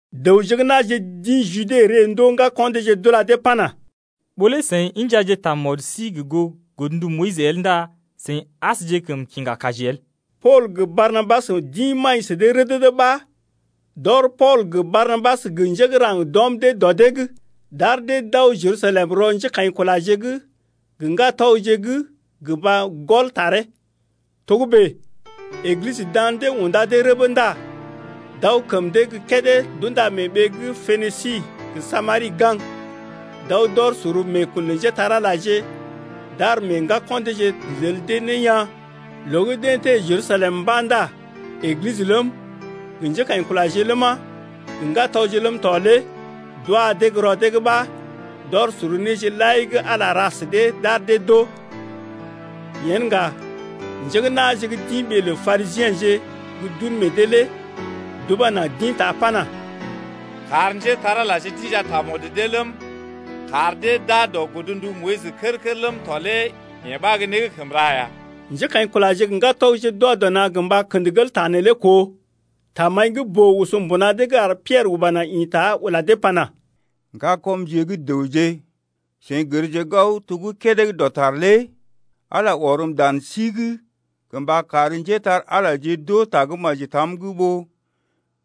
Dəwje gə́ na̰je d’ḭ Jude ree ndoo ŋgako̰ deeje d’ula dee pana: Ɓó lé seḭ injaje tamɔd sí gə goo godndu Moyis el ndá seḭ asjekəm kiŋga kaji el. Pool gə Barnabas d’ḭ maḭ sə dee rədədə ɓa d’ɔr Pool gə Barnabas gə njé gə́ raŋg d’ɔm dee dɔ dee’g, d’ar dee d’aw Jerusalem rɔ njékaḭkulaje’g gə ŋgatɔgje’g gə mba gɔl taree. Togə́bè Eglisə dan dee unda dee rəbə ndá d’aw kəm dee gə́ kédé d’unda mee ɓee gə́ Penisi gə Samari gaŋg, d’aw d’ɔr sor meekun lə njépole-magəje, d’ar meḛ ŋgako̰ deeje lel dee ne yaa̰. Loo gə́ deḛ teḛ Jerusalem mba̰ ndá Eglisə ləm, gə njékaḭkulaje ləma, gə ŋgatɔgje ləm tɔ lé d’wa dee gə́ rɔ dee’g ɓa, d’ɔr sor néje lai gə́ Ala ra sə dee d’ar dee d’oo. Yen ŋga njé gə́ na̰je gə́ d’ḭ ɓee lə Parisiḛje gə́ d’un meḛ dee lé d’uba naŋg d’ḭta pana: Kar njépole-magəje d’inja tamɔd dee ləm, kar dee d’aa dɔ godndu Moyis kər-kər ləm tɔ lé yee ɓa gə́ né gə́ kəm ra ya. Njékaḭkulaje gə ŋgatɔgje d’wa dɔ na̰ gə mba kə̰d gel ta neelé koo. Tamaḭ gə́ boo oso mbuna dee’g ar Piɛrə uba naŋg ḭta ula dee pana: Ŋgakɔmje gə́ dəwje, seḭ gərje gao to gə́ kédé gə́ dɔtar lé Ala ɔrm dan sí’g gə mba kar njépole-magəje d’oo tagə́maji tam’g ɓó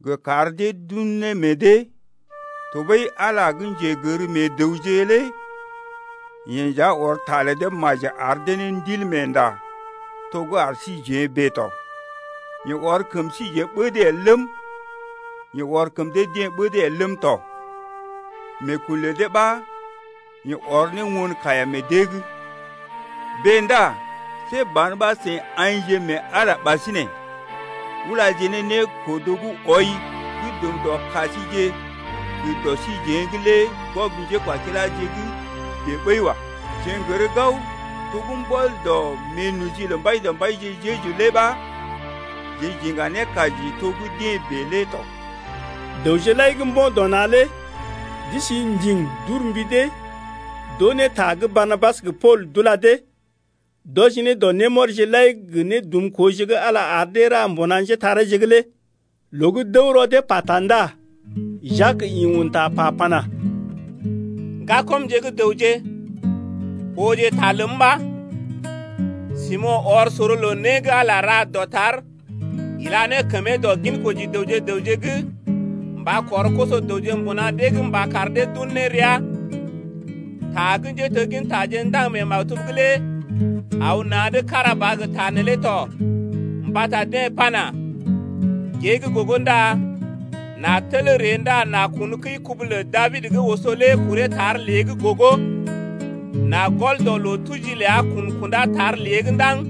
gə kar dee d’un ne meḛ dee. Tɔɓəi Ala gə́ njegər meḛ dəwje lé yeḛ nja ɔr ta lə dee maji ar dee ne Ndilmeenda to gə́ ar síjeḛ bèe tɔ. Yeḛ ɔr kəm síjeḛ ɓəd el ləm, yeḛ ɔr kəm dee-deḛ ɓəd el ləm tɔ. Meekun lə dee ɓa yeḛ ɔr ne won kaiya meḛ dee’g. Bèe ndá see ban ɓa seḭ aḭje mee Ala ɓasinè ulaje ne nékodo gə́ wɔi gə́ dum dɔ ka síje gə dɔ síjeḛ’g lé gwɔb njékwakiláje’g bèe ɓəi wa. Jeḛ n’gər gao to gə́ mbɔl dɔ meenoji lə Mbaidɔmbaije Jeju lé ɓa jeḛ j’iŋga ne kaji to gə́ deḛ bèe lé tɔ. Dəwje lai gə́ mbo̰ dɔ na̰ lé d’isi ndiŋ d’ur mbi dee d’oo ne ta gə́ Barnabas gə Pool d’ula dee, d’wɔji ne dɔ némɔrije lai gə nédumkooje gə́ Ala ar dee ra mbuna njétareeje’g lé. Loo gə́ d’əw rɔ dee pata ndá Jak ḭ un ta pa pana: Ŋgakɔmje gə́ dəwje, ooje ta ləm ɓa. Simo̰ ɔr sor loo né gə́ Ala ra dɔtar ila ne kəmee dɔ ginkoji dəwje gə raŋg’g mba kɔr koso-dəwje mbuna dee’g mba kar dee d’un ne ria. Ta gə́ njéteggintaje ndaŋg mee maktub’g lé aw na̰’d kára ba gə ta neelé to mbata deḛ pana: Gée gə́ gogo ndá n’a tel ree Ndá n’a kun kəi-kubu lə Dabid gə́ oso lé kuree tar lée gogo. N’a gɔl dɔ loo-tuji ləa kun kunda tar lée’g ɗaŋg,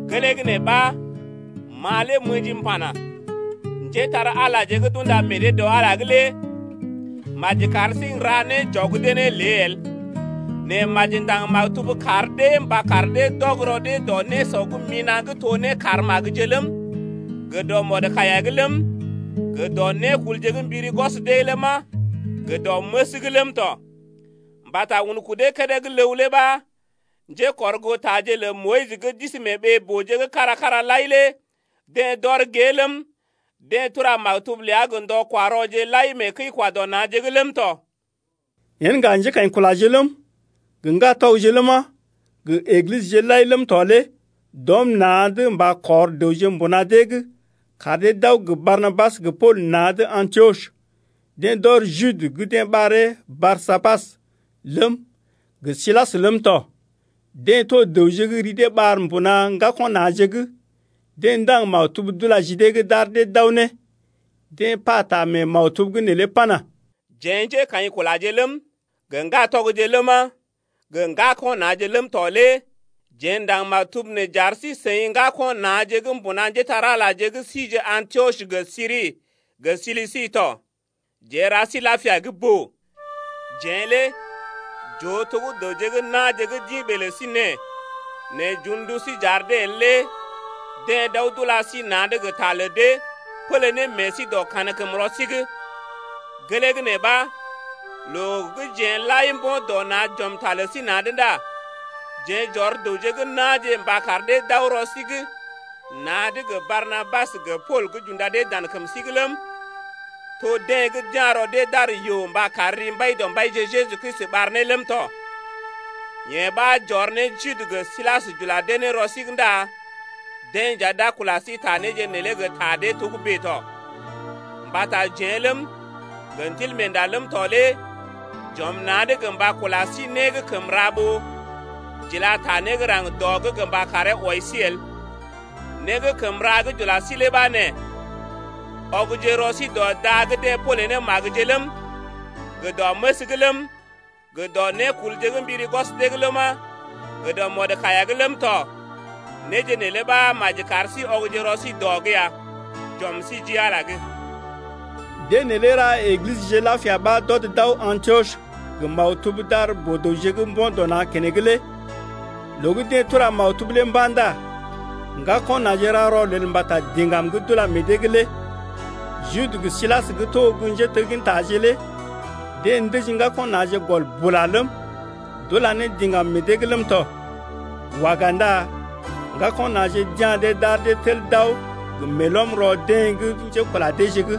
Gelee gə́ nee ɓa ma lé m’ə̰ji m’pana: Njétar-Alaje gə́ d’unda meḛ dee dɔ Ala’g lé maji kar sí n’ra né j’ɔg dee ne lé el. Nɛ maji ndaŋg maktub kar dee mba kar dee d’ɔg rɔ dee dɔ nésɔ gə́ mina̰ gə́ to nékar magəje ləm, gə dɔ mɔdkaiya’g ləm, gə dɔ nékulje gə́ mbiri gwɔs dee ləma, gə dɔ məs’g ləm tɔ. Mbata un kudee kédé gə́ ləw lé ɓa njékɔrgootaje lə Moyis gə́ d’isi mee ɓee-booje’g kára-kára lai lé deḛ d’ɔr gée ləm, deḛ tura maktub ləa gə ndɔ-kwa-rɔje lai mee kəi-kwa-dɔ-na̰je’g ləm tɔ. Yen ŋga njékaḭkulaje ləm, gə ŋgatɔgje ləma, gə Eglisəje lai ləm tɔ lé d’ɔm na̰’d mba kɔr dəwje mbuna dee’g kar dee d’aw gə Barnabas gə Pool na̰’d Antiɔs. Deḛ d’ɔr Jude gə́ deḛ ɓaree Barsabas ləm, gə Silas ləm tɔ. Deḛ to dəwje gə́ ri dee ɓar mbuna ŋgako̰ na̰je’g. Deḛ ndaŋg maktub d’ula ji dee’g d’ar dee d’aw ne, deḛ pata mee maktub’g neelé pana: Jeḛ njékaḭkulaje ləm, gə ŋgatɔgje ləma, gə ŋgako̰ na̰je ləm tɔ lé jeḛ ndaŋg maktub nee j’ar sí-seḭ ŋgako̰ na̰je gə́ mbuna njépole-magəje gə́ sije Antiɔs gə Siri gə Silisi tɔ. Jeḛ n’ra sí lapia gə́ boo. Jeḛ lé j’oo to gə́ dəwje gə́ na̰je gə́ d’ḭ ɓee lə sí nee nɛ j’un ndu sí j’ar dee el lé deḛ d’aw d’ula sí na̰’d gə ta lə dee, pélé ne meḛ sí dɔ kankəmrɔ sí’g. Gelee gə́ nee ɓa loo gə́ jeḛ lai mbo̰ dɔ na̰ j’ɔm ta lə sí na̰’d ndá jeḛ j’ɔr dəwje gə́ na̰je mba kar dee d’aw rɔ sí’g na̰’d gə Barnabas gə Pool gə́ j’unda dee dan kəm sí’g ləm, to deḛ gə́ d’ya̰ rɔ dee d’ar yoo mba kar ri Mbaidɔmbaije Jeju Kristi ɓar ne ləm tɔ. Yee ɓa j’ɔr ne Jude gə Silas j’ula dee ne rɔ sí’g ndá deḛ nja d’a kula sí ta néje neelé gə ta dee togə́bè tɔ. Mbata jeḛ ləm, gə Ndilmeenda ləm tɔ lé j’ɔm na̰’d gə mba kula sí né gə́ kəm ra ɓó j’ila ta né gə́ raŋg dɔ’g gə mba karee wɔi sí el. Né gə́ kəm ra gə́ j’ula sí lé ɓa nee: Ɔgje rɔ sí dɔ da gə́ deḛ pole ne magəje ləm, gə dɔ məs’g ləm, gə dɔ nékulje gə́ mbiri gwɔs dee’g ləma, gə dɔ mɔdkaiya’g ləm tɔ. Néje neelé ɓa maji kar sí ɔgje rɔ sí dɔ’g ya. J’ɔm sí ji Ala’g. Deḛ neelé ra Eglisəje lapia ɓa d’ɔd d’aw Antiɔs ɓa gə maktub d’ar boo-dəwje gə́ mbo̰ dɔ na̰ keneŋ lé. Loo gə́ deḛ tura maktub lé mba̰ ndá ŋgako̰ na̰je ra rɔlel mbata diŋgam gə́ d’ula meḛ dee’g lé. Jude gə́ Silas gə́ to gə́ njéteggintaje lé deḛ ndəji ŋgako̰ na̰je gɔl bula ləm, d’ula ne diŋgam meḛ dee’g ləm tɔ. Waga ndá ŋgako̰ na̰je d’ya̰ dee d’ar dee tel d’aw gə meelɔm rɔ deḛ gə́ njékula deeje’g lé.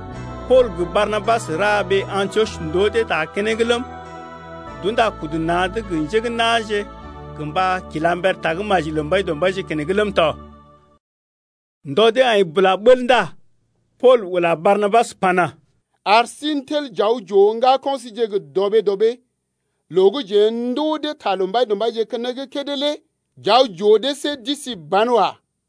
Pool gə Barnabas ra ɓee Antiɔs ndoo dee ta keneŋ ləm, d’unda kudu dee na̰’d gə njé gə́ na̰je gə mba kila mber tagə́maji lə Mbaidɔmbaije keneŋ ləm tɔ. Ndɔ dee aḭ bula bəl ndá Pool ula Barnabas pana: Ar sí n’tel j’aw j’ooje ŋgako̰ síje gə dɔɓee-dɔɓee loo gə́ jeḛ ndoo dee ta lə Mbaidɔmbaije keneŋ kédé lé j’aw j’oo dee see d’isi banwa.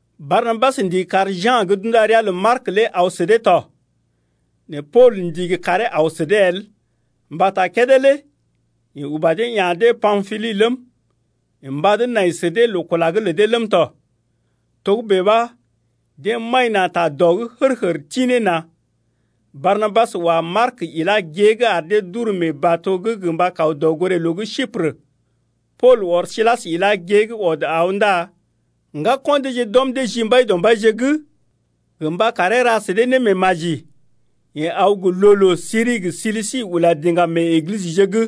Barnabas ndigi kar Ja̰ gə́ d’unda ria lə Mark lé aw sə dee tɔ. Nɛ Pool ndigi karee aw sə dee el mbata kédé lé yeḛ uba dee ya̰ dee Pampili ləm, yeḛ mbad nai sə dee loo-kula’g lə dee ləm tɔ. Togə́bè ɓa deḛ maḭ na̰ ta dɔ’g hər-hər tḭ ne na̰. Barnabas wa Mark ilá gée’g ar dee d’uru mee bato’g gə mba kaw dɔgoré-loo gə́ Siprə. Pool ɔr Silas ilá gée’g ɔd aw ndá ŋgako̰ deeje d’ɔm dee ji Mbaidɔmbaije’g gə mba karee ra sə dee némeemaji. Yeḛ aw gə loo-loo Siri gə Silisi ula diŋgam mee Eglisəje’g.